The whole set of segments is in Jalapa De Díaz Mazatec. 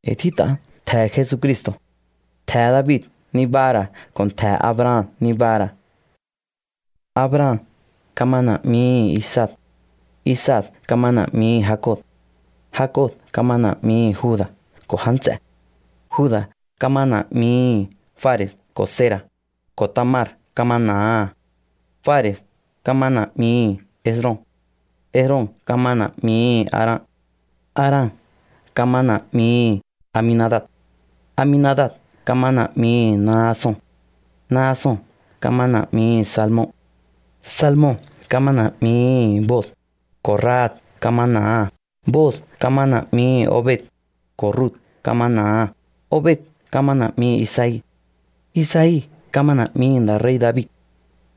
E̱i̱ tjít'a ntje̱he̱ Jesucristo̱. Ntje̱he̱ David nibaha̱ ra̱ ko̱ ntje̱he̱ Abraham nibaha̱ ra̱. Abraham kama na̱'mihi̱ Isaac. Isaac kama na̱'mihi̱ Jacob. Jacob kama na̱'mihi̱ Juda̱ ko̱ já nts'e̱. Juda̱ kama na̱'mihi̱ Fare̱s ko̱ Zera̱, ko̱ Tamar kama na̱aha̱. Fare̱s kama na̱'mihi̱ Esrom. Esrom kama na̱'mihi̱ Aram. Aram kama na̱'mihi̱ Aminadab. Aminadab kama na̱'mihi̱ Naason. Naason kama na̱'mihi̱ Salmon. Salmon kama na̱'mihi̱ Booz, ko̱ Rahab kama na̱aha̱. Booz kama na̱'mihi̱ Obed, ko̱ Rut kama na̱aha̱. Obed kama na̱'mihi̱ Isai. Isai kama na̱'mihi̱ nda̱ rei̱ David.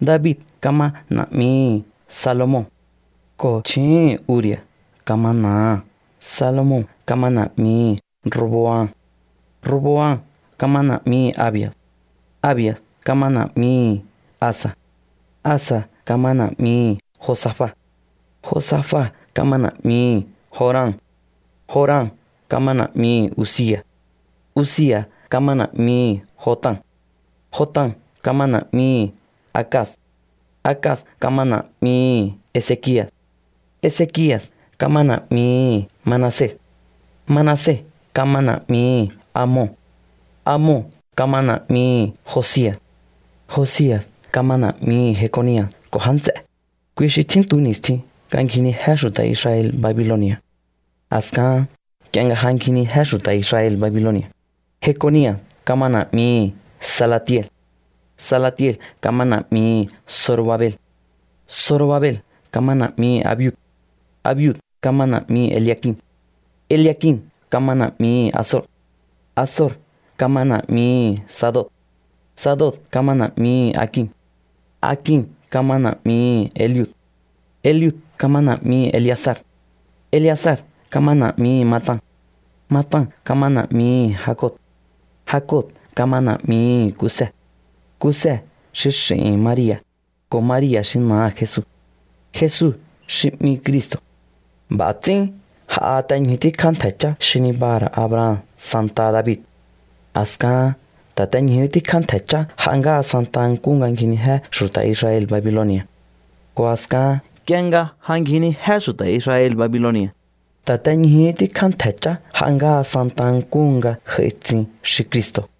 David kama na̱'mihi̱ Salomon, ko̱ chju̱úhu̱n Urias kama na̱aha̱. Salomon kama na̱'mihi̱ Roboam. Roboam kama na̱'mihi̱ Abias. Abias kama na̱'mihi̱ Asa. Asa kama na̱'mihi̱ Josafat. Josafat kama na̱'mihi̱ Joram. Joram kama na̱'mihi̱ Uzia̱s. Uzia̱s kama na̱'mihi̱ Jotam. Jotam kama na̱'mihi̱ Acaz. Acaz kama na̱'mihi̱ Ezekia̱s. Ezekia̱s kama na̱'mihi̱ Manases. Manases kama na̱'mihi̱ Amon. Amon kama na̱'mihi̱ Josia̱s. Josia̱s kama na̱'mihi̱ Jeconia̱s ko̱ já nts'e̱. Kui xi tjíntu ni̱stjin nga ngjinijé xu̱ta̱ Israel Babiloni̱a̱. A̱skaha̱n nk'ie nga ja ngjinijé xu̱ta̱ Israel Babiloni̱a̱, Jeconia̱s kama na̱'mihi̱ Salatiel. Salatiel kama na̱'mihi̱ Zorobabel. Zorobabel kama na̱'mihi̱ Abiud. Abiud kama na̱'mihi̱ Eliakim. Eliakim kama na̱'mihi̱ Azor. Azor kama na̱'mihi̱ Sadoc. Sadoc kama na̱'mihi̱ Akim. Akim kama na̱'mihi̱ Eliud. Eliud kama na̱'mihi̱ Eleazar. Eleazar kama na̱'mihi̱ Matan. Matan kama na̱'mihi̱ Jacob. Jacob kama na̱'mihi̱ Kuse. Kuse xi x'i̱hi̱n Maria̱, ko̱ Maria̱ xi na̱aha̱ Jesu. Jesu xi 'mihi̱ Cristo̱. B'a̱ ts'ín j'aha te ñju tíkjá ntje̱ chá xi nibaha̱ ra̱ Abraham santaha David. A̱skahan ta̱ te ñjuhú tíkjá ntje̱ chá j'a ngáha santa nkúhu nga ngjinijé xu̱ta̱ Israel Babiloni̱a̱. Ko̱ a̱skahan nk'ie nga ja ngjinijé xu̱ta̱ Israel Babiloni̱a̱, ta̱ te ñjuhú tíkjá ntje̱ chá j'a ngáha santa nkúhu nga j'ai tsin xi Cristo̱.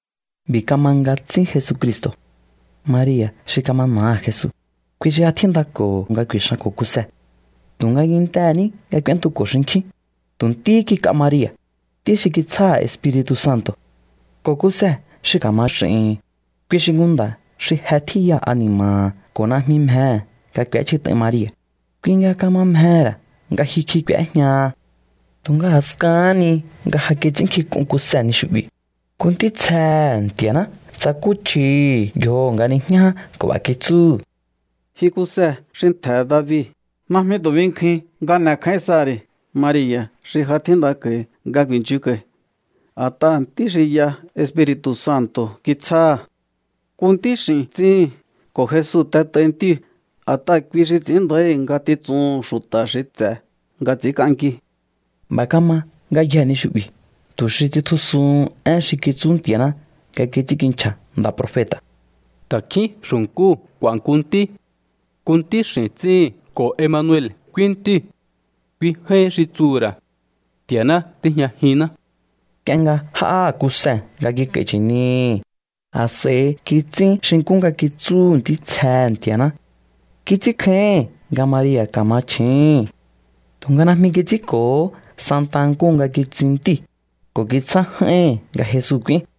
B'i̱ kama nga tsín Jesucristo̱. Maria̱ xi kama na̱aha̱ Jesu, kui xi ja tjíndako̱ho̱ nga ku̱i̱xanko̱ Kuse. Tu̱nga kintehe̱ ní nga k'úéntuko̱ xinkjín, tu̱ ntíhí kik'a Maria̱, ntí xi kitsjáha̱ Espiri̱tu̱ Santo̱. Ko̱ Kuse xi ka̱ma x'i̱hi̱n, kui xi nku nda̱ xi je tjíya ani̱ma̱ha̱ ko̱ najmi mjehe̱ nga k'u̱échjit'ain Maria̱. Kui nga kama mjehe̱ ra̱ nga jyukj'i k'u̱éjñaha. Tu̱nga a̱skahán ni nga ja kits'ínnkjink'un Kuse ni xu'bi̱, nku ntítsjehe̱ Nti̱a̱ná tsakúchjihi̱ yjoho̱ nga nijñá ján ko̱ b'a̱ kitsúhu̱: —Ji Kuse xi ntje̱he̱ David, najmi tu̱ binkjuin nga n'e̱kjáín saha̱ ri̱ Maria̱ xi ja tjíndako̱hi nga ku̱i̱nchjunko̱hi. A̱t'aha̱ ntí xi y'a Espiri̱tu̱ Santo̱ kitsjáha̱. Nku ntíx'i̱n tsíhin ko̱ Jesu t'et'aihi̱ ntíu̱, a̱t'aha̱ kui xi ts'i̱ín nda̱íhi̱ ngatitsuhu̱n xu̱ta̱ xi ts'e̱ nga ts'i̱ínk'anki. B'a̱ kama ngayjee̱ ni xu'bi̱ tu̱ xi tsitjusuhun én xi kitsú Nti̱a̱ná nga kits'ínkinchja̱ nda̱ profeta̱: Ta̱kjín xu̱nkúu̱ k'u̱a̱ nku ntí. Nku ntíx'i̱n tsíhi̱n ko̱ Emanuel k'úín ntíu̱. Kui j'áín xi tsuhu̱ ra̱: Nti̱a̱ná tíjñajinná. Nk'ie nga j'áha̱ Kuse nga kik'a̱i̱ chi̱nihi̱, a̱s'a̱i kits'ín xi nkú nga kitsúhu̱ ntítsjehe̱ Nti̱a̱ná. Kits'ínkjáíhi̱n nga Maria̱ ka̱ma chju̱úhún. Tu̱nga najmi kits'ínko̱hó santa nkúhu nga kitsin ntíu̱, ko̱ kitsjá j'áíhi̱n nga Jesu k'úín.